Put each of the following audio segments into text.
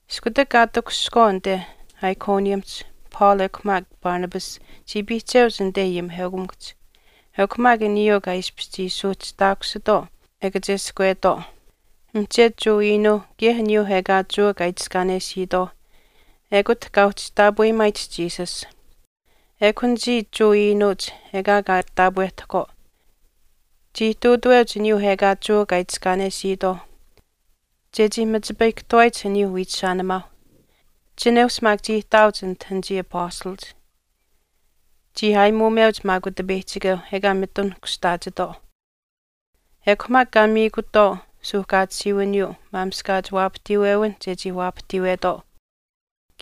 Iskutak kaa takushihkwaau anite Iconiumihch, Paul ekw maak Barnabas chii piihcheuch anite ayimiheukamikuhch, ekw maak aniyuu kaa ishpish chii suuhchihtaakusitwaau e kacheskwetwaau mihchetu Jewa iinuuh kaye aniyuu ekaa Jewa kaa itiskaanesiitwaauh ekut kaa uhchi taapweyimaayich Jesus. Ekw anichii Jewa iinuuch ekaa kaa taapwehtahkwaau, chii ihtuutaweuch aniyuu ekaa Jewa kaa itiskaanesiitwaauh chechii machipayihkahtuwaayich aniyuu wiichishaanimaauh. Chineush maak chii ihtaauch anit anichii apastalach. Chii aayimuumeuch maak Utipeyihchikeu ekaa mitun kushtaachitwaau. Ekw maak kaa miikutwaau suuhkaatisiiwiniyuu maamishkaach waapahtiiwewinh chechii waapahtiiwetwaau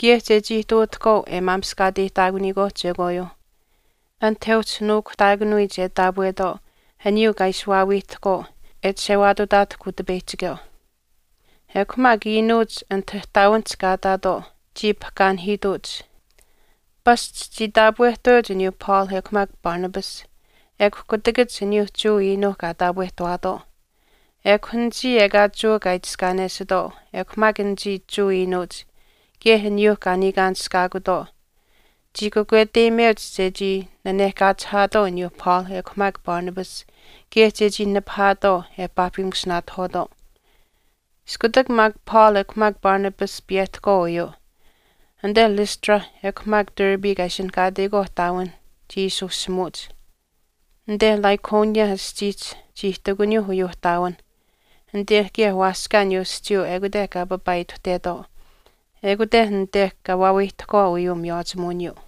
kaye chechii ihtuutahkwaau e maamishkaateyihtaakuniyikwaauh chekwaayuuh, anit e uhchi nuukuhtaakanuyich e taapwetwaau aniyuu kaa ishi waawiihtahkwaau e chishewaatutaatahkw Utipeyihchikeu. Ekw maak iinuuch anit ihtaawinihch kaa ihtaatwaau chii pahkaanihiituuch, pasch chii taapwehtaweuch aniyuu Paul ekw maak Barnabas, ekw kutakach aniyuuh Jewa iinuuh kaa taapwehtawaatwaau. Ekw anichii ekaa Jewa kaa itiskaanesitwaau ekw maak anichii Jewa iinuuch kaye aniyuu kaa niikaanishkaakutwaau chii kakweteyimeuch chechii nanehkaachihaatwaau aniyuu Paul ekw maak Barnabas kaye chechii nipahaatwaau e paahpimusinaatahwaatwaau. Iskutak maak Paul ekw maak Barnabas piyehtahkwaau uyuu, anite Lystra ekw maak Derbe kaa ishinihkaateyikwaauh ihtaawinh chii ishi ushimuuch. Anite Lycaonia aschiihch chii ihtakuniyuu uyuu ihtaawinh. Anite kaye waaskaa aniyuu aschiiyuu ekute kaa papaaituhtetwaau. Ekut anite kaa waawiihtahkwaau uyuu miywaachimuwiniyuu.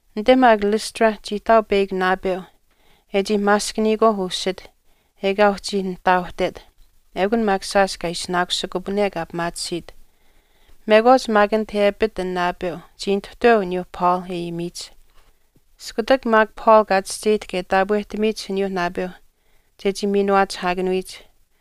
Anite maak Lystra chii ihtaau peyakw naapeu e chii maaskaniyikwaauh usit ekaa uhchi nihtaautet ekun maak shaash kaa ishinaakusikupane kaa pimaatisiit. Mekwaach maak anit e apit an naapeu chii nituhtaweu aniyuu Paul e ayimiyich. Iskutak maak Paul kaa chischeyihtahk e taapwehtamiyich aniyuu naapeu chechii miinuwaachihaakanuyich,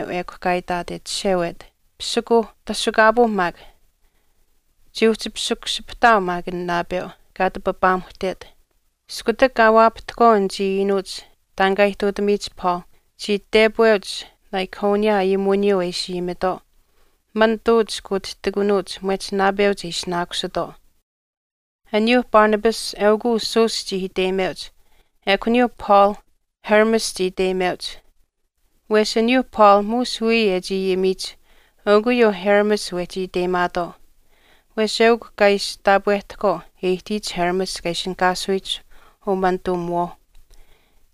ekw kaa itaat e chishewet, “Pisikuuh, tashukaapuu maak.” Chii uhchi pisikushipahtaau an naapeu, kaa ati papaamuhtet. Iskutak kaa waapahtahkwaau anichii iinuuch taan kaa ihtuutamiyich Paul, chii tepweuch Lycaonia ayimuwiniyuu e ishi ayimitwaau, “Manituuch kuutihtikunuuch mwehch naapeuch e ishinaakusitwaau.” Aniyuu Barnabas eukw uu Zeus chii iteyimeuch. Ekw aniyuu Paul Hermes chii iteyimeuch. Wesh aniyuu Paul muush wiya e chii ayimiyich eukw uyuu Hermes wehchi iteyimaatwaau. Wesh eukw kaa ishi taapwehtahkwaau e ihtiyich Hermes kaa ishinihkaasuyich umanituumiwaau.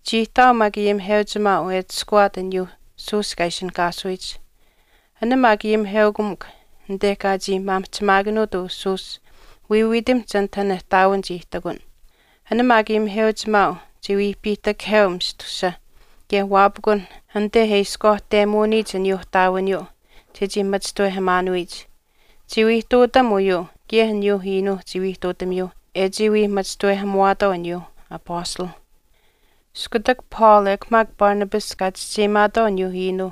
Chii ihtaau maak ayimiheuchimaau e atushkuwaat aniyuu Zeus kaa ishinihkaasuyich. An maak ayimiheukamikw anite kaa chii maamihchimaakanuut uu Zeus wiiwiitamihch anit an ihtaawin chii ihtakun. An maak ayimiheuchimaau chiwii piihtakaheu mistusa kaye waapikun anite e ishkwaahtemuuniyich aniyuu ihtaawiniyuu chechii machishtawehamaanuyich. Chii wii ihtuutam uyuu kaye aniyuuh iinuuh chii wii ihtuutamiyuuh e chii wii machishtawehamuwaatwaau aniyuu apastalh. Iskutak Paul ekw maak Barnabas kaa chischeyimaatwaau aniyuu iinuu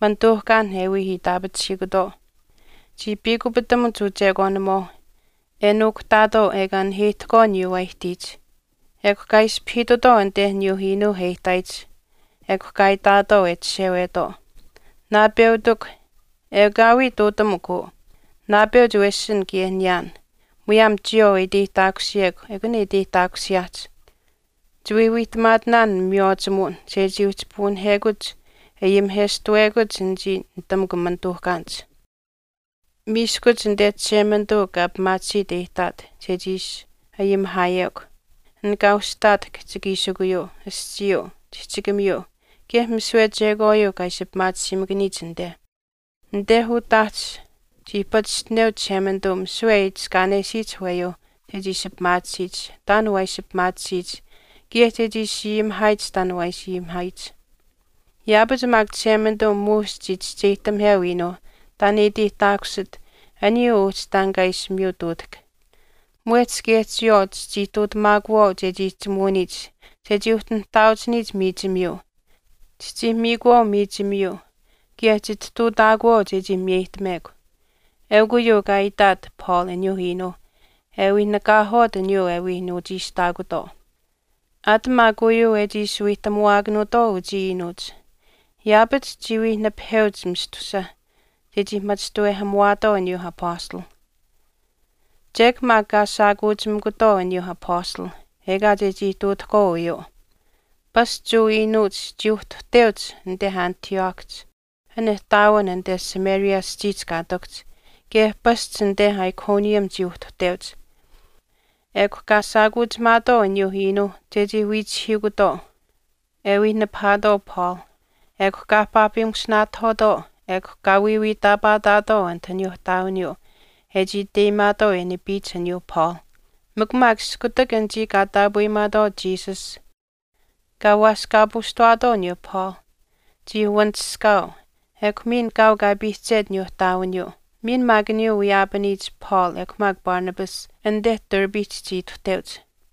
manituuhkaan e wii itaapachihiikutwaau chii piikupitamuch uchekwaanimuwaauh e nuukuhtaatwaau ekaa naheyihtahkwaau aniyuu waa ihtiyich, ekw kaa ispahiitutwaau anite aniyuu iinuu e ihtaayich ekw kaa itaatwaau e chishewetwaau, “Naapeutikw ekaawii ihtuutamukw uu, naapeuch wesin kaye niyaan muyaam chiyawaau e iteyihtaakusiyekw ekun e iteyihtaakusiyaahch. Chiwii wiihtamaatinaan miywaachimuwin chechii uhchi puunihekuch e ayimiheshtawekuch anichii nitamukw manituuhkaanich. Miiskuch anite Chishemanituu kaa pimaatisiit e ihtaat chechii ishi ayimihaayekw, an kaa ushihtaat kihchikiishikuyuu, aschiiyuu, chihchikamiyuu kaye misiwe chekwaayuu kaa ishi pimaatisiimakaniyich anite. Anite utaahch chii pachishtineu Chishemanituu misiwe e itiskaanesiyich aweyuu chechii ishi pimaatisiyich taan waa ishi pimaatisiyich kaye chechii ishi ayimihaayich taan waa ishi ayimihaayich. Yaapach maak Chishemanituu muush chii chischeyihtamiheu iinuu taan e iteyihtaakusit aniyuu uhchi taan kaa ishi miyutuutahk, mwehch kaye chiyawaau chichii ihtuutamaakuwaau chechii chimuuniyich chechii uhchi nihtaauchiniyich miichimiyuu. Chichii miikuwaau miichimiyuu kaye chitihtuutaakuwaau chechii miyeyihtamekw.” Eukw uyuu kaa itaat Paul aniyuu iinuu e wii nikaahwaat aniyuu e wii nuuchiishtaakutwaau. Aat maak uyuu e chii ishi wiihtamuwaakanuutwaau uchii iinuuch yaapach chii wii nipaheuch mistusa chechii machishtawehamuwaatwaau aniyuu apastalh. Chek maak kaa shaakuuchimikutwaau aniyuu apastalh ekaa chechii ihtuutahkwaau uyuu. Pasch Jewa iinuuch chii uhtuhteuch anite Antiochihch an ihtaawin anite Pisidia aschiihch kaa ihtakuhch, kaye pasch anite Iconium chii uhtuhteuch, ekw kaa shaakuuchimaatwaau aniyuu iinuu chechii wiichihiikutwaau e wii nipahaatwaau Paul. Ekw kaa paahpimusinaatahwaatwaau ekw kaa wiiwiitaapaataatwaau anit aniyuu ihtaawiniyuu e chii iteyimaatwaau e nipiyich aniyuu Paul. Mikw maak iskutak anichii kaa taapweyimaatwaau Jesus kaa waaskaapuushtawaatwaau aniyuu Paul, chii wanishkaau ekw miin kaau kaa piihchet aniyuu ihtaawiniyuu. Miin maak aniyuu wiyaapaniyich Paul ekw maak Barnabas anite Derbehch chii ituhteuch.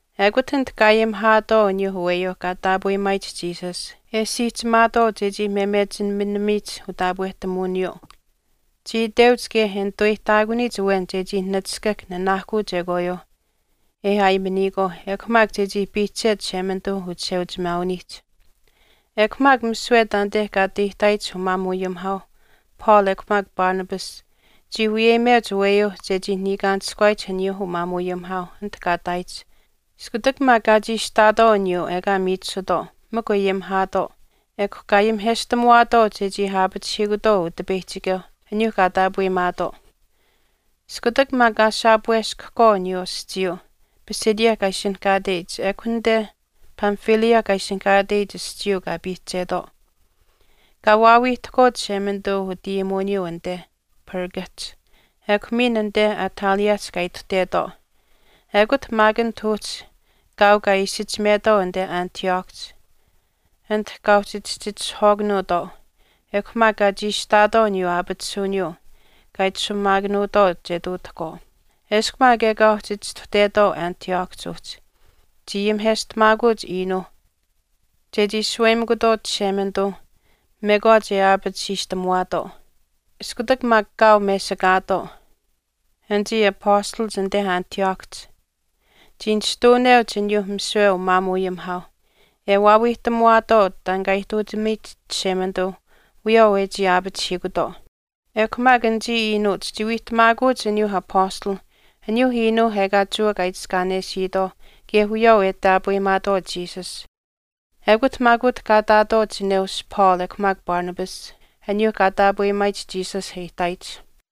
Ekut anit kaa ayimihaatwaau aniyuu aweyuu kaa taapweyimaayich Jesus e siihchimaatwaau chechii memechiminimiyich utaapwehtamuwiniyuu. Chii iteuch kaye e nituweyihtaakuniyich awen chechii nachishkahk nanaahkuu chekwaayuuh e aayimaniyikwaau ekw maak chechii piihchet Chishemanituu uchisheuchimaawinihch. Ekw maak misiwe taanite kaa ati ihtaayich umaamuuayimihaauh Paul ekw maak Barnabas chii wiyeyimeuch aweyuu chechii niikaanishkuwaayich aniyuu umaamuuayimihaauh anit kaa ihtaayich. Iskutak maak kaa chiishihtaatwaau aniyuu ekaa miichisutwaau mikw e ayimihaatwaau ekw kaa ayimiheshtamuwaatwaau chechii aapachihiikutwaau Utipeyihchikeuh, aniyuuh kaa taapweyimaatwaau. Iskutak maak kaa shaapuweshkahkwaau aniyuu aschiiyuu Pisidia kaa ishinihkaateyich ekw anite Pamphylia kaa ishinihkaateyich aschiiyuu kaa piihchetwaau. Kaa waawiihtahkwaau Chishemanituu utayimuwiniyuu anite Pergahch. Ekw miin anite Attaliahch kaa ituhtetwaau. Ekut maak anit uhchi kaau kaa isichimetwaau anite Antiochihch, anit kaa uhchi chihchitishahwaakanuutwaau ekw maak kaa chiishihtaatwaau aniyuu aapatisuwiniyuu kaa itashumaakanuutwaau chechii ihtuutahkwaau. Eshkw maak ekaa uhchi chistuhtetwaau Antiochihch uhchi, chii ayimiheshtamaakuch iinuu chechii shaweyimikutwaau Chishemanituu mekwaach e aapatisiishtamuwaatwaau. Iskutak maak kaau mesikaatwaau anichii apastalach anite Antiochihch, chii nishtuuneuch aniyuu misiwe umaamuuayimihaauh e waawiihtamuwaatwaau taan kaa ihtuutamiyich Chishemanituu wiyawaau e chii aapachihiikutwaau. Ekw maak anichii iinuuch chii wiihtamaakuch aniyuu apastalh, aniyuu iinuuh ekaa Jewa kaa itiskaanesiitwaauh kaye wiyawaau e taapweyimaatwaau Jesus. Ekut maak utah kaa ihtaatwaau chineush Paul ekw maak Barnabas aniyuu kaa taapweyimaayich Jesus e ihtaayich.